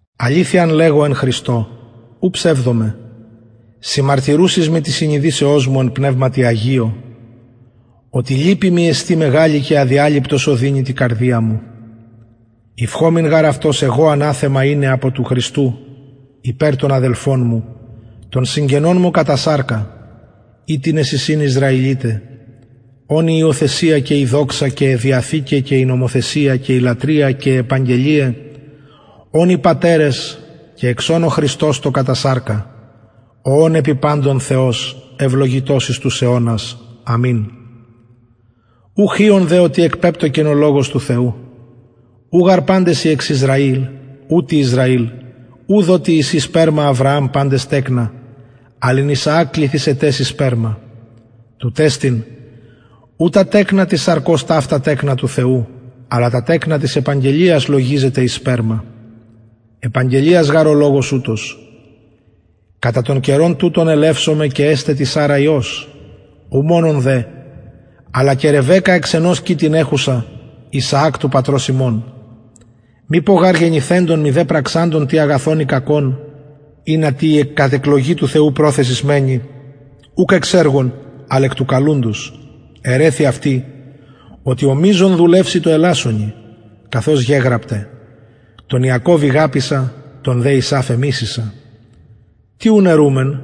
αληθειαν λεγω εν χριστω ου ψευδομαι συμμαρτυρουσης μοι της συνειδησεως μου εν πνευματι αγιω οτι λυπη μοι εστιν μεγαλη και αδιαλειπτος οδυνη τη καρδια μου ευχομην γαρ αυτος εγω αναθεμα ειναι απο του χριστου υπερ των αδελφων μου των συγγενων μου κατα σαρκα οιτινες εισιν ισραηλιται ων η υιοθεσια και η δοξα και αι διαθηκαι και η νομοθεσια και η λατρεια και αι επαγγελιαι ων οι πατερες και εξ ων ο χριστος το κατα σαρκα ο ων επι παντων θεος ευλογητος εις τους αιωνας αμην ουχ οιον δε οτι εκπεπτωκεν ο λογος του θεου ου γαρ παντες οι εξ ισραηλ ουτοι ισραηλ ουδ οτι εισιν σπερμα αβρααμ παντες τεκνα αλλ εν ισαακ κληθησεται σοι σπερμα τουτ εστιν ου τα τεκνα της σαρκος ταυτα τεκνα του θεου αλλα τα τεκνα της επαγγελιας λογιζεται εις σπερμα επαγγελιας γαρ ο λογος ουτος κατα τον καιρον τουτον ελευσομαι και εσται τη σαρρα υιος ου μονον δε αλλα και ρεβεκκα εξ ενος κοιτην εχουσα ισαακ του πατρος ημων μηπω γαρ γεννηθεντων μηδε πραξαντων τι αγαθον η κακον ινα η κατ εκλογην προθεσις του θεου μενη ουκ εξ εργων αλλ εκ του καλουντος ερρηθη αυτη οτι ο μειζων δουλευσει τω ελασσονι καθως γεγραπται τον ιακωβ ηγαπησα τον δε ησαυ εμισησα τι ουν ερουμεν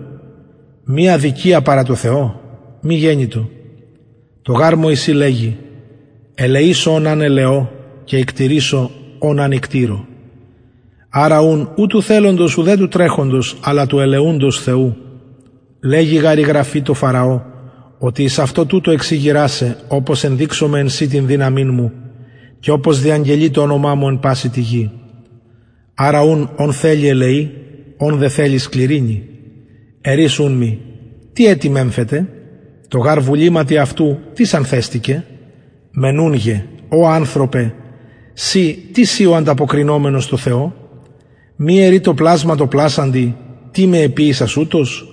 μη αδικια παρα τω θεω μη γενοιτο τω γαρ μωυση λεγει ελεησω ον αν ελεω και οικτειρησω ον αν οικτειρω αρα ουν ου του θελοντος ουδε του τρεχοντος αλλα του ελεουντος θεου λεγει γαρ η γραφη τω φαραω οτι εις αυτο τουτο εξηγειρα σε οπως ενδειξωμαι εν σοι την δυναμιν μου και οπως διαγγελη το ονομα μου εν παση τη γη αρα ουν ον θελει ελεει ον δε θελει σκληρυνει ερεις ουν μοι τι ετι μεμφεται τω γαρ βουληματι αυτου τις ανθεστηκεν μενουνγε ω ανθρωπε συ τις ει ο ανταποκρινομενος τω θεω μη ερει το πλασμα τω πλασαντι τι με εποιησας ουτως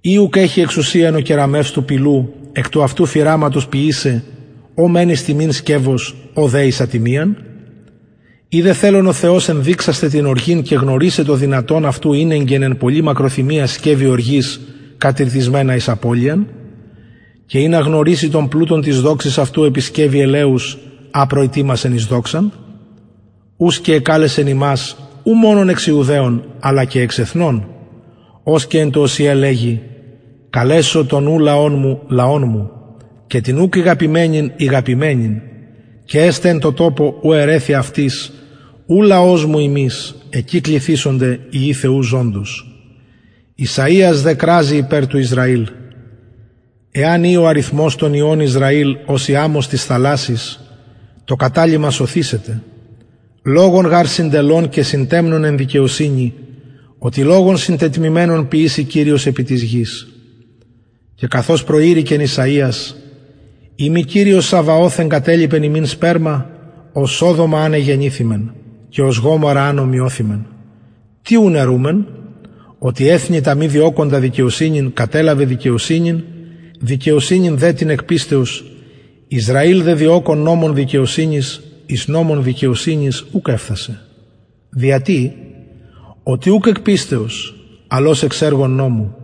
η ουκ εχει εξουσιαν ο κεραμευς του πηλου εκ του αυτου φυραματος ποιησαι ο μεν εις τιμην σκευος ο δε εις ατιμιαν ει δε θελων ο θεος ενδειξασθαι την οργην και γνωρισαι το δυνατον αυτου ηνεγκεν εν πολλη μακροθυμια σκευη οργης κατηρτισμενα εις απωλειαν και ινα γνωριση τον πλουτον της δοξης αυτου επι σκευη ελεους α προητοιμασεν εις δοξαν ους και εκαλεσεν ημας ου μονον εξ ιουδαιων αλλα και εξ εθνων ως και εν τω ωσηε λεγει καλεσω τον ου λαον μου λαον μου και την ουκ ηγαπημενην ηγαπημενην και εσται εν τω τοπω ου ερρηθη αυτοις ου λαος μου υμεις εκει κληθησονται υιοι θεου ζωντος ησαιας δε κραζει υπερ του ισραηλ εαν η ο αριθμος των υιων ισραηλ ως η αμμος της θαλασσης το καταλειμμα σωθησεται λογον γαρ συντελων και συντεμνων εν δικαιοσυνη οτι λογον συντετμημενον ποιησει κυριος επι της γης και καθως προειρηκεν ησαιας ει μη κυριος σαβαωθ εγκατελιπεν ημιν σπερμα ως σοδομα αν εγενηθημεν και ως γομορρα αν ωμοιωθημεν τι ουν ερουμεν οτι εθνη τα μη διωκοντα δικαιοσυνην κατελαβεν δικαιοσυνην δικαιοσυνην δε την εκ πιστεως ισραηλ δε διωκων νομον δικαιοσυνης εις νομον δικαιοσυνης ουκ εφθασεν δια τι οτι ουκ εκ πιστεως αλλ ως εξ εργων νομου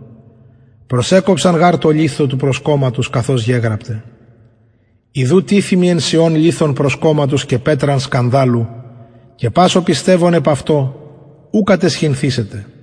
προσεκοψαν γαρ τω λιθω του προσκομματος καθως γεγραπται ιδου τιθημι εν σιων λιθον προσκομματος και πετραν σκανδαλου και πας ο πιστευων επ αυτω ου καταισχυνθησεται